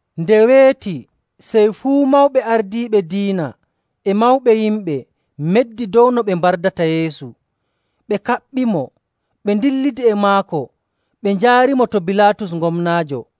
Nde weeti, sey fuu mawɓe ardiiɓe diina e mawɓe yimɓe meddi dow no ɓe mbardata Yeesu. Ɓe kaɓɓimo, ɓe ndillidi e maako ɓe njaarimo to Bilaatus gomnaajo.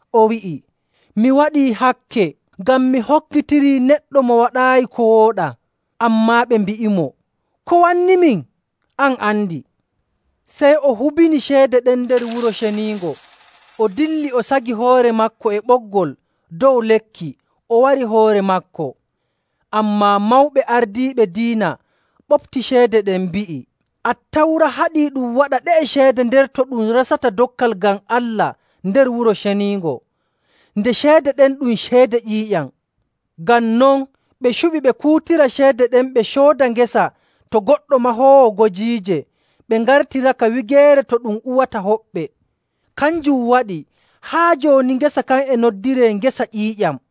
O wi'i, “Mi waɗii hakke ngam mi hokkitirii neɗɗo mo waɗaayi ko wooɗaa.” Ammaa ɓe mbi'imo, “Ko wannimin? An andi!” Sey o hubini ceede ɗen nder Wuro Ceniingo, o dilli o sagi hoore maako e ɓoggol dow lekki o wari hoore maako. Ammaa mawɓe ardiiɓe diina ɓopti ceede ɗen, mbi'i, “Attawra haɗii ɗum waɗa ɗe'e ceede nder to ɗum resata dokkal ngam Allah nder Wuro Ceniingo, nde ceede ɗen ɗum ceede ƴiiƴam.” Ngam non ɓe cuɓi ɓe kuutira ceede ɗen ɓe cooda ngesa to goɗɗo mahoowo gojiije, ɓe ngartiraka wigeere to ɗum uwata hoɓɓe. Kanjum waɗi, haa jooni ngesa kan e noddiree “Ngesa Ƴiiƴam.”.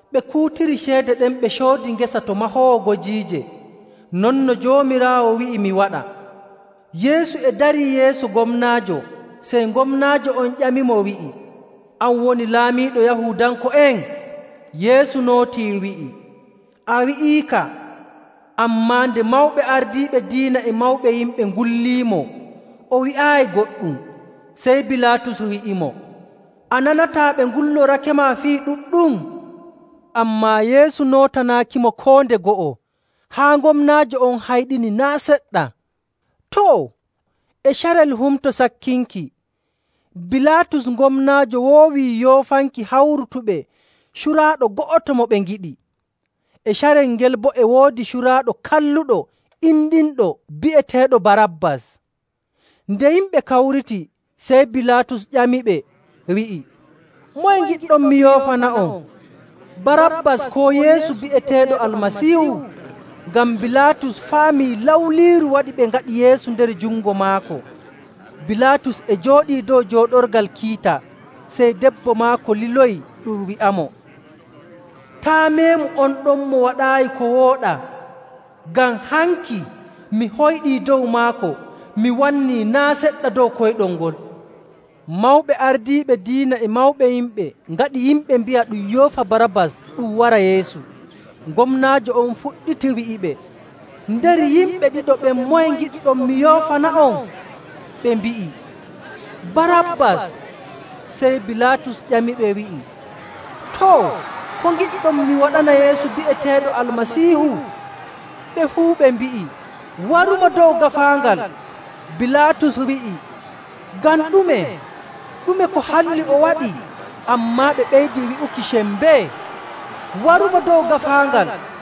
Ɓe kuutiri ceede ɗen ɓe coodi ngesa to mahoowo gojiije, non no Joomiraawo wi'i mi waɗa.”. Yeesu e darii yeeso gomnaajo, sey gomnaajo on ƴamimo, wi'i, “An woni laamiiɗo Yahuudanko'en?” Yeesu nootii wi'i, “A wi'iika.” Ammaa nde mawɓe ardiiɓe diina e mawɓe yimɓe ngulliimo, o wi'aayi goɗɗum. Sey Bilaatus wi'imo, “A nanataa ɓe ngullorakema fii ɗuɗɗum?” Ammaa Yeesu nootanaakimo koo nde go'o, haa gomnaajo on hayɗini naa' seɗɗa. Too, e carel Humto Sakkinki, Bilaatus gomnaajo woowii yoofanki hawrutuɓe curaaɗo go'oto mo ɓe ngiɗi. E carel ngel boo e woodi curaaɗo kalluɗo indinɗo bi'eteeɗo Barabbas. Nde yimɓe kawriti, sey Bilaatus ƴamiɓe, wi'i, “Moye ngiɗɗon mi yoofana'on? Barabbas koo Yeesu bi'eteeɗo Almasiihu?” Ngam Bilaatus faamii lawliiru waɗi ɓe ngaɗi Yeesu nder jungo maako. Bilaatus e jooɗii dow jooɗorgal kiita, sey debbo maako liloyi ɗum wi'amo, “Taa' meemu on ɗon mo waɗaayi ko wooɗaa, ngam hanki mi hoyɗii dow maako mi wannii naa' seɗɗa dow koyɗol ngol.” Mawɓe ardiiɓe diina e mawɓe yimɓe ngaɗi yimɓe mbi'a ɗum yoofa Barabbas ɗum wara Yeesu. Gomnaajo on fuɗɗiti wi'iɓe, “Nder yimɓe ɗiɗo ɓen moye ngiɗɗon mi yoofana'on?” Ɓe mbi'i, “Barabbas!” Sey Bilaatus ƴamiɓe wi'i, “Too, ko ngiɗɗon mi waɗana Yeesu bi'eteeɗo Almasiihu?” Ɓe fuu ɓe mbi'i, “Warumo dow gaafaangal!” Bilaatus wi'i, “Ngam ɗume? Ɗume ko halli o waɗi?” Ammaa ɓe ɓeydi wi'uki sembee, “Warumo dow gaafaangal!”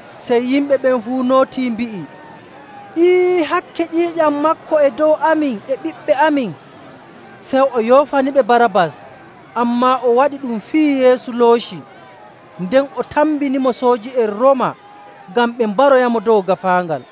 Sey yimɓe ɓen fuu nootii, mbi'i, “Ee, hakke ƴiiƴam maako e dow amin e ɓiɓɓe amin!” Sey o yoofaniɓe Barabbas, ammaa o waɗi ɗum fiyi Yeesu looci, nden o tambinimo sooji'en Rooma ngam ɓe mbaroyamo dow gaafaangal.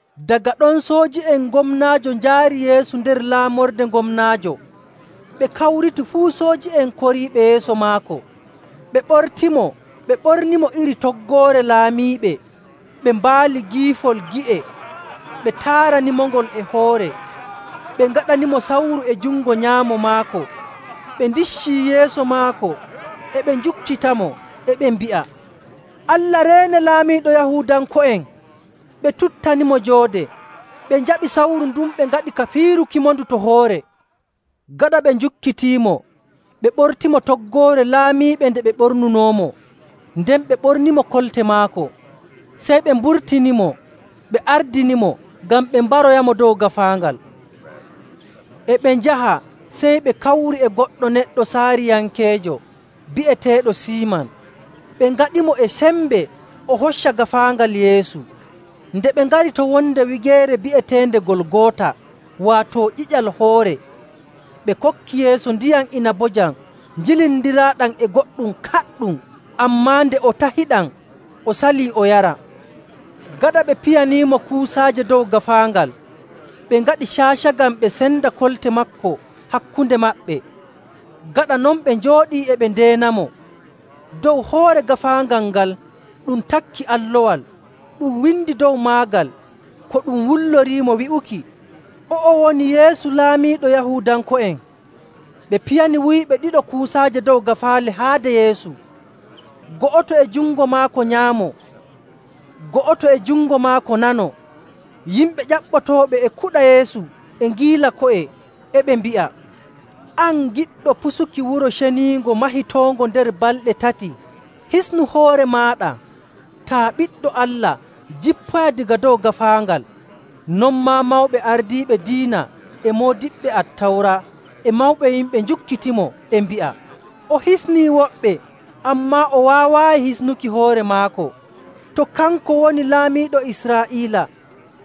Daga ɗon sooji'en gomnaajo njaari Yeesu nder laamorde gomnaajo, ɓe kawriti fuu sooji'en koriiɓe yeeso maako. Ɓe ɓortimo ɓe ɓornimo iri toggoore laamiiɓe. Ɓe mbaali giifol gi'e, ɓe taaranimongol e hoore, ɓe ngaɗanimo sawru e jungo nyaamo maako, ɓe ndiccii yeeso maako, e ɓe njukkitamo, e ɓe mbi'a, “Allah reene, laamiiɗo Yahuudanko'en!” Ɓe tuttanimo joode, ɓe njaɓi sawru ndun ɓe ngaɗi ka piirukimondu to hoore. Gaɗa ɓe njukkitiimo, ɓe ɓortimo toggoore laamiiɓe nde ɓe ɓornunoomo, nden ɓe ɓornimo kolte maako. Sey ɓe mburtinimo ɓe ardinimo ngam ɓe mbaroyamo dow gaafaangal. E ɓe njaha sey ɓe kawri e goɗɗo neɗɗo Saayirankeejo bi'eteeɗo Siiman. Ɓe ngaɗimo e sembe o hocca gaafaangal Yeesu. Nde ɓe ngari to wonde wigeere bi'eteende Golgoota, waato “Ƴiƴal Hoore,” ɓe kokki Yeesu ndiyam inabojam jillindiraaɗam e goɗɗum kaɗɗum. Ammaa nde o tahiɗam, o salii o yara.. Gaɗa ɓe piyaniimo kuusaaje dow gaafaangal, ɓe ngaɗi caaca ngam ɓe cenda kolte maako hakkunde maɓɓe.. Gaɗa non ɓe njooɗii e ɓe ndeenamo. Dow hoore gaafaangal ngal ɗum takki allowal. Ɗum windi dow maagal ko ɗum wulloriimo wi'uki, “O'o woni Yeesu Laamiiɗo Yahuudanko'en.” Ɓe piyani wuyɓe ɗiɗo kuusaaje dow gaafaale haade Yeesu, go'oto e jungo maako nyaamo, go'oto e jungo maako nano. Yimɓe ƴaɓɓotooɓe e kuɗa Yeesu e ngiila ko'e,. e ɓe mbi'a, “An giɗɗo pusuki Wuro Ceniingo mahitoongo nder balɗe tati, hisnu hoore maaɗa! Taa Ɓiɗɗo Allah, jippoya daga dow gaafaangal!”. Non maa mawɓe ardiiɓe diina, e moodiɓɓe Attawra, e mawɓe yimɓe njukkitimo, e mbi'a, “O hisnii woɓɓe, ammaa o waawaayi hisnuki hoore maako. To kanko woni Laamiiɗo Israa'iila,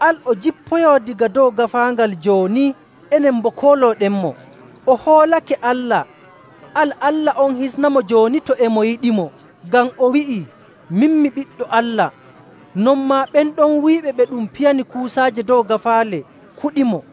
al o jippoyoo daga dow gaafaangal jooni, enen boo koolooɗenmo. O hoolake Allah. Al Allah on hisnamo jooni to e mo yiɗimo, ngam o wi'ii, ‘Min mi Ɓiɗɗo Allah.’”. Non maa ɓen ɗon wuyɓe ɓe ɗum piyani kuusaaje dow gaafaale kuɗimo.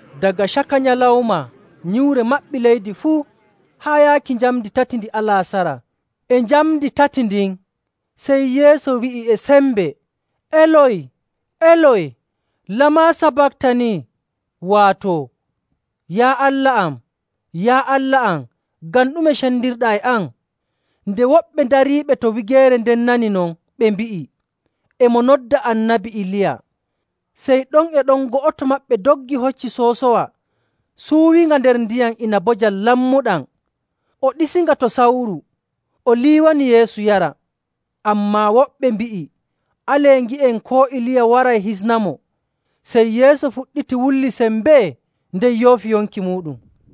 Daga caka nyalawma nyiwre maɓɓi leydi fuu, haa yaaki njamndi tati ndi alaasara. E njamndi tati ndin, sey Yeesu wi'i e sembe, “Eloy, Eloy, lama sabattani?” waato, “Yaa Allah am, Yaa Allah am, ngam ɗume cendirɗaa e am?”. Nde woɓɓe dariiɓe to wigeere nden nani non, ɓe mbi'i, “E mo nodda Annabi Iliya.” Sey ɗon e ɗon go'oto maɓɓe doggi hocci soosowa, suuwinga nder ndiyam inabojam lammuɗam, o ɗiisinga to sawru, o liwanii Yeesu yara.. Ammaa woɓɓe mbi'i, “Alee ngi'en koo Iliya waray hisnamo.” Sey Yeesu fuɗɗiti wulli sembee nden yoofi yonki muuɗum.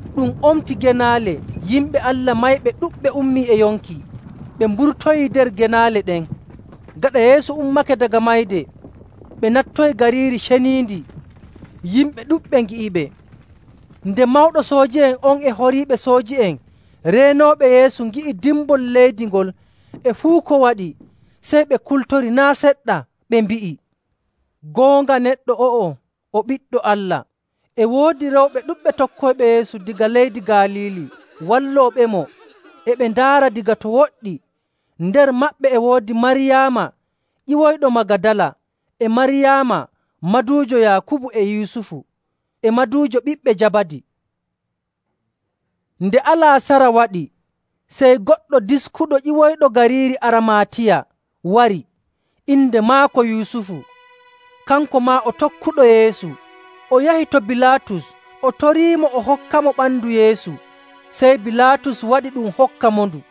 Ɗum omti genaale, yimɓe Allah mayɓe ɗuɗɓe ummii e yonki. Ɓe mburtoyii nder genaale ɗen. Gaɗa Yeesu ummake daga mayde, ɓe nattoyi gariiri ceniindi: Waato Urucaliima., yimɓe ɗuɗɓe ngi'iɓe. Nde mawɗo sooji'en on e horiiɓe sooji'en reenooɓe Yeesu ngi'i dimbol leydi ngol e fuu ko waɗi, sey ɓe kultori naa' seɗɗa, ɓe mbi'i, “Goonga neɗɗo o'o o Ɓiɗɗo Allah!” E woodi rewɓe ɗuɗɓe tokkoyɓe Yeesu daga leydi Galiili wallooɓemo e ɓe ndaara daga to woɗɗi. Nder maɓɓe e woodi Maryaama ƴiwoyɗo Magadala, e Maryaama maduujo Yaakubu e Yusufu, e maduujo ɓiɓɓe Jabadi.. Nde alaasara waɗi, sey goɗɗo diskuɗo ƴiwoyɗo gariiri Armaatiya wari. Inde maako Yusufu. Kanko maa o tokkuɗo Yeesu. O yahi to Bilaatus, o toriimo o hokkamo ɓandu Yeesu. Sey Bilaatus waɗi ɗum hokkamondu.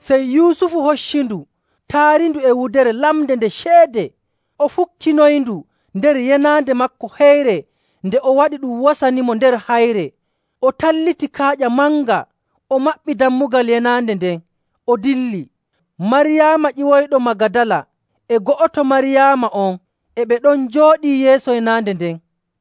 Sey Yusufu hocci ndu taarindu e wudere lamnde nde ceede. O fukkinoyndu nder yenaande maako heyre nde o waɗi ɗum wasanimo nder hayre. O talliti kaaƴa manga o maɓɓi dammugal yenaande nden, o dilli. Maryaama ƴiwoyɗo Magadala e go'oto Maryaama on e ɓe ɗon njooɗii yeeso yenaande nden.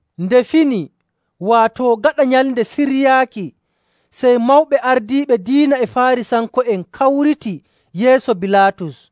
Nde fini, waato gaɗa Nyalnde Siryaaki, sey mawɓe ardiiɓe diina e Faarisanko'en kawriti yeeso Bilaatus.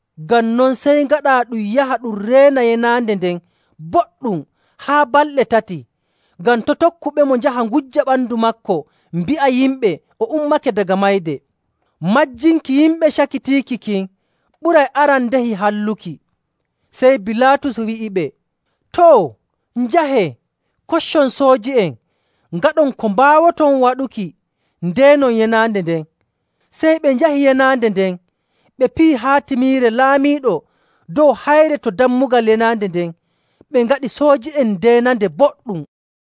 Ngam non, sey ngaɗaa ɗum yaha ɗum reena yenaande nden boɗɗum haa balɗe tati, ngam to' tokkuɓemo njaha ngujja ɓandu maako mbi'a yimɓe o ummake daga mayde. Majjinki yimɓe cakitiiki kin ɓuray arandehi halluki.” Sey Bilaatus wi'iɓe, “Too, njahee, koccon sooji'en, ngaɗon ko mbaawoton waɗuki ndeenon yenaande nden.” Sey ɓe njahi yenaande nden ɓe piyi haatimiire laamiiɗo dow hayre to dammugal yenaande nden, ɓe ngaɗi sooji'en ndeenande boɗɗum.